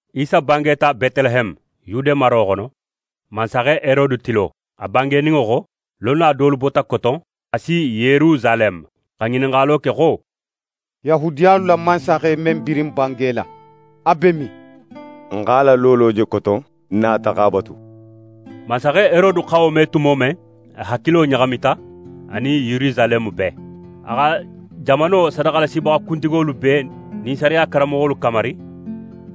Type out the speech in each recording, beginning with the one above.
Isa bangeta Betileheme, Yude maro xono, mansaxe Herode tilo, a bangeninŋo xo, lonna dolu bota Koton xa si Yerusaleme, xa ŋininxalo ke xo: «Yahudiyalu la mansaxe men birin bangela, a be min? N x'a la loolo je Koton, n nata x'a batu.» Mansaxe Herode xa wo me tumo men, a hakilo ɲaxamita anin Yerusaleme bee. A xa jamano sadaxalasibaxa kuntigolu bee nin sariya karanmoxolu kamari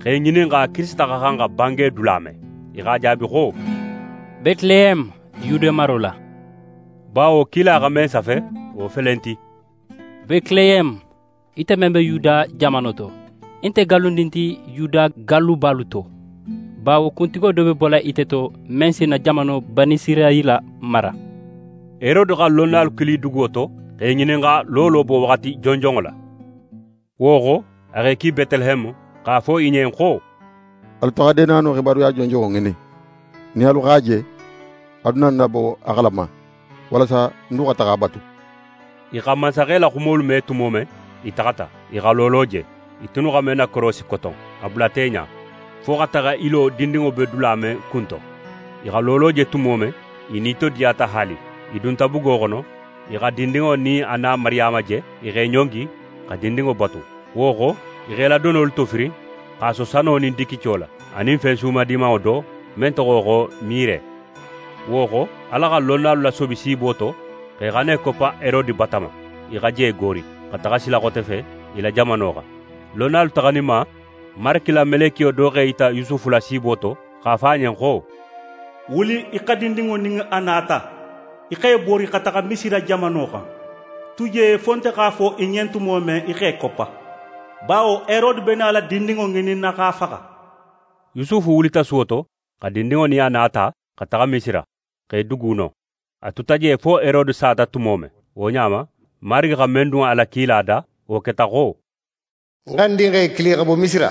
x'e ŋininxa Kirisita xa xan xa bange dula men. I x'a jaabi xo: «Betileheme, Yude maro la», bawo kila xa men safe, wo felenti: «Betileheme, ite men be Yuda jamano to, í nte gallundin ti Yuda gallubalu to; bawo kuntigo do be nala bola ite to, men si ń na jamano, Banisirayila mara.» Herode xa lonnalu kili duguwo to, x'e ŋininxa loolo bowaxati jonjonŋo la. Wo xo, a x'e ki Betileheme x'a fo i ɲen xo: «Alu taxa deenano xibaruya jonjonŋo ŋinin. Nin alu x'a je, alu na ń nabo a xalama, walasa ń du xa taxa a batu.» I xa mansaxe la xumolu me tumo men, i taxata. I xa loolo je, i tunnu xa men nakorosi Koton, a bulata i ɲa, fo xa taxa í lo dindinŋo be dula men kunto. I xa loolo je tumo men, i nitodiyata haali. I dunta bugo xono, i xa dindinŋo nin a na Mariyama je. I x'e ɲongi, xa dindinŋo batu. Wo xo, i x'e la donolu tofirin x'a so sano nin digico la, anin fen suma dimanŋo do, men toxo xo mire. Wo xo, Ala xa lonnalu lasobi siibo to xo i xana i koppa Herode bata ma. I xa je goori, xa taxa sila xote fe i la jamano xan. Lonnalu taxaninma, Marigi la melekiyo do x'é yita Yusufu la siibo to, x'a fo a ɲen xo: «Wuli í xa dindinŋo nin a na ta, í x'é bori xa taxa Misira jamano xan. Tu je fo nte x'a fo í ɲen tumo men í x'é koppa; bawo Herode be nala dindinŋo ŋininna x'a faxa.» Yusufu wulita suwo to, xa dindinŋo nin a na ta xa taxa Misira, x'é dugu non. A tuta je fo Herode sata tumo men. Wo ɲa ma, Marigi xa men dun a la kila da, wo keta xo: «Ń xa ń dinxe kili xa bo Misira.»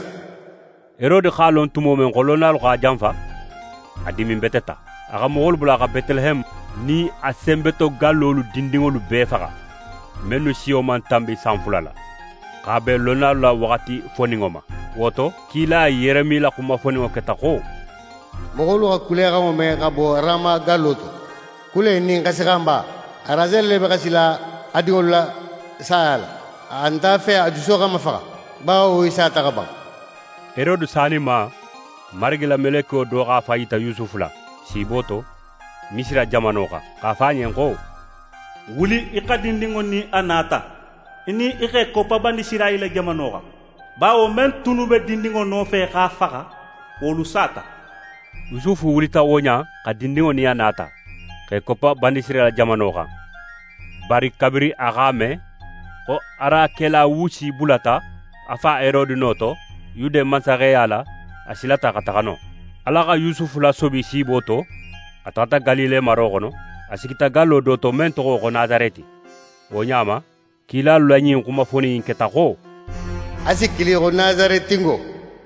Herode x'a lon tumo men xo lonnalu x'a janfa, a diminbeteta. A xa moxolu bula xa Betileheme nin a senbetogallolu dindinŋolu bee faxa, mennu siyo man tanbi san fula la, x'a ben lonnalu la waxati foninŋo ma. Wo to, kila Yeremi la xuma foninŋo keta xo: «Moxolu xa kulexanŋo me xa bo Rama gallo to, kule nin xasixanba, Raseli le be xasila a dinŋolu la saya la, a nte a fe a juso xa mafaxa, bawo i sata xa ban.» Herode saninma, Marigi la melekiyo do x'a fan yita Yusufu la, siibo to, Misira jamano xan, x'a fo a ɲen xo: «Wuli í xa dindinŋo nin a na ta, í nin i x'e koppa Banisirayila jamano xan, bawo men tunnu be dindinŋo nofe x'a faxa, wolu sata.» Yusufu wulita wo ɲa in xa dindinŋo nin a na ta, x'é koppa Banisirayila jamano xan. Bari kabirin a x'a me xo Arakelawusi bulata a fa Herode no to Yude mansaxeya la, a silata xa taxa non. Ala xa Yusufu lasobi siibo to, a taxata Galile maro xono. A sigita gallo do to men toxo xo Nasareti. Wo ɲa ma, kilalu la ɲin xuma fonin in keta xo: «A si kili xo Nasaretingo.»